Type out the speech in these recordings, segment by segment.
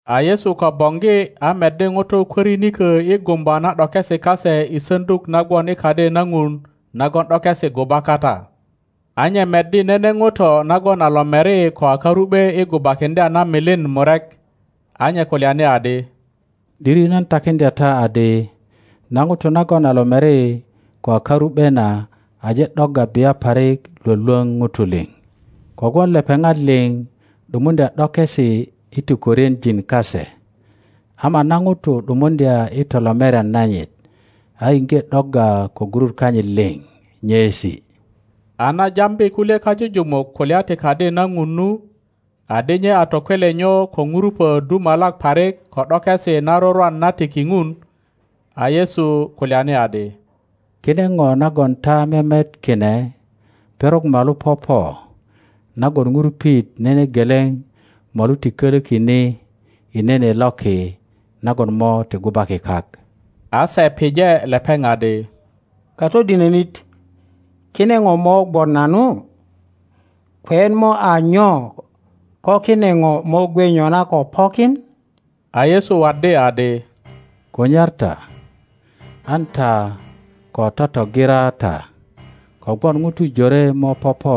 A Yesu ko boŋgi a meddi ŋutu kwörinikö i gumba na ’dokesi kase i saŋduk na gwon i Kadi na Ŋun nagon ’dokesi guba kata; a nye meddi nene ŋuto nagon a lomeri ko a karu ’be i gubakiŋdya na milin murek. A nye kulyani adi, ’Diri nan takiŋdya ta adi, na ŋuto nagon a lomeri ko a karu ’be na aje ’dogga bia parik lwölwöŋ ŋutu liŋ; kogwon lepeŋat liŋ ’dumundya ’dokesi i tukwörienjin kase; ama na ŋuto ’dumuŋdya i tolomerian nanyit, a iŋge ’dogga ko gurut kanyit liŋ nyeesi. A na jambi kulye kajujumuk kulya ti Kadi na Ŋun nu, adi nye a tokwelenyo ko ŋurupo dumalak parik ko ’dokesi na rurwan na tiki Ŋun, a Yesu kulyani adi, Kine ŋo nagon ta memet kine, perok molu popo nagon ŋurupit nene geleŋ molu ti koloki ni i nene loki nagon mo ti gubaki kak. A se pije lepeŋ adi, Katodinönit, kine ŋo mo gwon nanu? Kweyet mo a nyo ko kine ŋo mo gwe nyona ko pokin? A Yesu waddi adi, Kunyar ta, an ta ko totogira ta. Kogwon ŋutu jore mo popo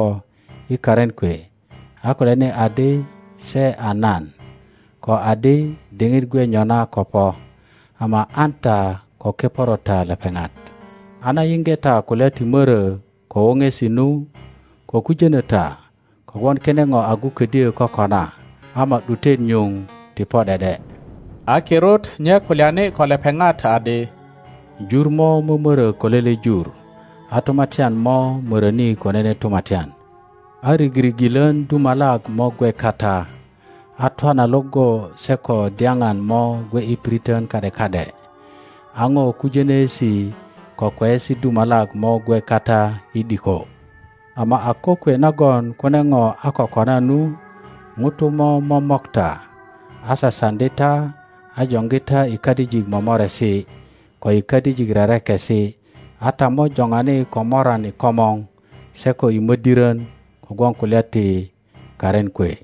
i karin kwe a kulyani adi se a nan, ko adi, Diŋit gwe nyona ko po. Ama an ta ko keporo ta lepeŋat. A na yiŋge ta kulya ti mörö ko woŋesi nu, ko kujönö ta, kogwon kine ŋo agu ködyö kokona, ama ’dutet nyuŋ ti po ’de ’de. A kirut nye kulyani ko lepeŋat adi, Jur mo mömörö ko lele jur, a tumatyan mo möroni ko nene tumatyan; a rigirigilön dumalak mo gwe kata, a twana iŋgo se ko dyaŋan mo gwe i piriton ka ’de ka ’de; a ŋo kujonöesi ko kweyesi dumalak mo gwe kata i ’diko. Ama a kokwe nagon kune ŋo a ko kona nu, ŋutu mo momok ta, a sasaŋdi ta a joŋgi ta i kadijik lomoresi, ko i kadijik rerekesi, a ta mo joŋani ko moran i komor se ko i mödiron kogwon kulya ti karin kwe.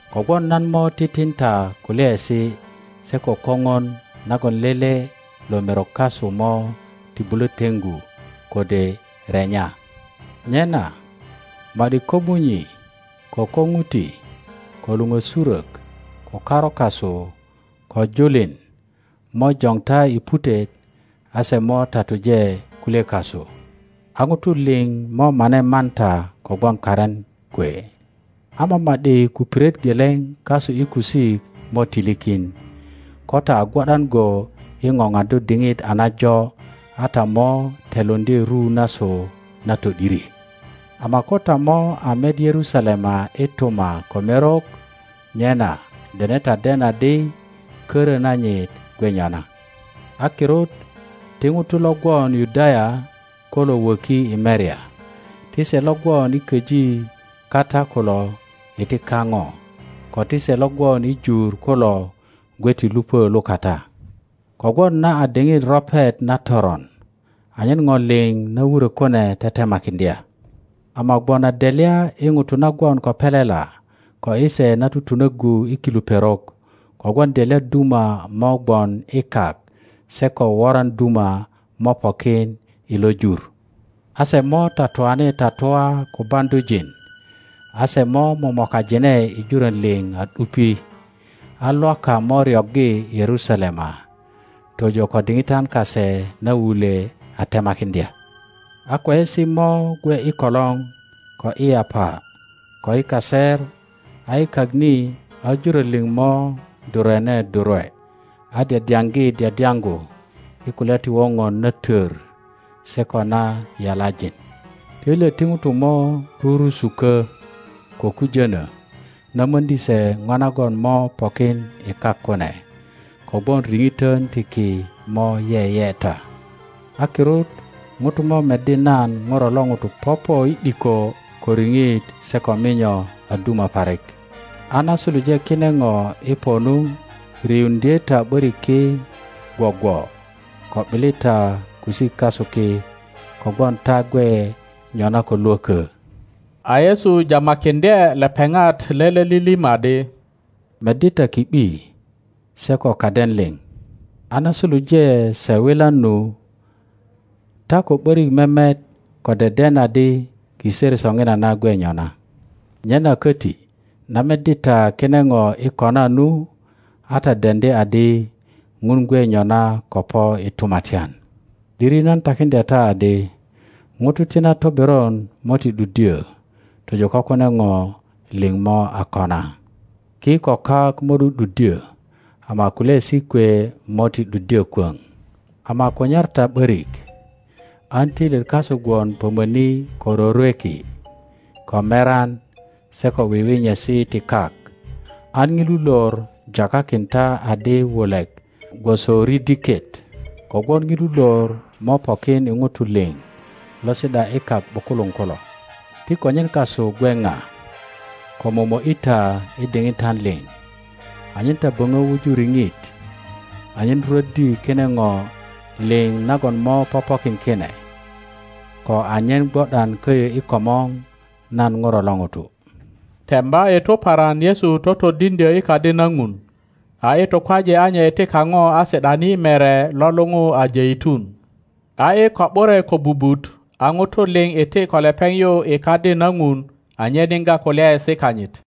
kogwon nan mo titin ta kulyaesi se ko koŋon nagon lele lo merok kasu mo ti bulö teŋgu kode renya. Nyena ma ’di komunyi ko koŋuti, ko luŋösurök, ko karu kasu, ko julin mojoŋ ta i putet, a se mo tatuje kulye kasu; a ŋutu liŋ mo mane man ta kogwon karin kwe. Ama ma ’di kupiret geleŋ kasu i kusik mo ti likin. Ko ta a gwo ’dan go i ŋoŋaddu diŋit a najo a ta mo telundye ru nasu na to ’diri. Ama ko ta mo a met Yerusalema i tuma ko merok, nyena dene ta den adi korö nanyit gwe nyona. A kirut ti ŋutu lo gwon Yudaya. kulo wöki i merya; ti se lo gwon i köji kata kulo iti kaŋo, ko ti se lo gwon i jur kulo gwe ti lupö lukata, kogwon na a diŋit ropet na toron; anyen ŋo liŋ na wurö kune tetemakiŋdya. Ama gwon a delya i ŋutu na gwon ko pelela, ko i se na tutunöggu i kilu perok! Kogwon delya duma mo gwon i kak se ko woran duma mo pokin i lo jur. a se mo tatuani tatua ko baŋdujin, a se mo momokajine i jurön liŋ a ’dupi, a Lwaka mo ryoggi Yerusalema, tojo ko diŋitan kase na wulwe a temakiŋdya. A kweyesi mo gwe i kolor, ko i yapa, ko i kaser, a i kak ni a jurön liŋ mo durwene durwe, a dyadyaŋgi dyadyaŋgu i kulya ti woŋon na tor se ko na yalajin; töilyet ti ŋutu mo rurusukö ko kujönö na möŋdi se ŋo nagon mo pokin i kak kune, kogwon riŋitön ti ki mo yeyeta. a kirut ŋutu mo meddi nan Ŋuro lo ŋuto popo i ’diko ko riŋit se ko minyo a duma parik. A na suluje kine ŋo i po nu, riuŋdye ta ’börik ki gwogwo, ko ’bili ta kusik kasu ki, kogwon ta gwe nyona ko lwökö. A Yesu jamakiŋdye lepeŋat lele lilim adi, Meddi ta ki ’bi se ko kaden liŋ; a na suluje se wilan nu, ta ko ’borik memet ko deden adi kiser soŋinana gwe nyona. Nyena köti na meddi ta kine ŋo i kona nu, a ta deŋdi adi Ŋun gwe nyona ko po i tumatyan. ’Diri nan takiŋdya ta adi, ŋutu ti na toberon mo ti ’duddyö tojo ko kune ŋo liŋ mo a kona. Ki ko kak mo ’du ’duddyö ama kulyaesi kwe mo ti ’duddyö kwöŋ. Ama kunyar ta ’börik an töilyet kasu gwon pömöni ko rorweki, ko meran se ko wiwinyesi ti kak, an ŋilu lor jakakin ta adi wulek gwoso ridiket; kogwon ŋilu lor mo pokin i ŋutu liŋ lo si ’da i kak ’bukuluŋ kulo. Ti konyen kasu gwe ŋa ko momo ’yi ta i diŋitan liŋ, anyen ta böŋö wuju riŋit anyen rwöddi kine ŋo liŋ nagon mo popokin kine, ko anyen gwo ’dan köyo i komor nan ŋuro lo ŋuto. Temba i tuparan Yesu totodiŋdyö i Kadi na Ŋun, a i tukwaje a nye iti kaŋo a si ’dani i mere lo luŋu a Jeitun. A i ko ’bure kobubut a ŋutu liŋ iti ko lepeŋ yu i Kadi na Ŋun anyen yiŋga kulyaesi kanyit.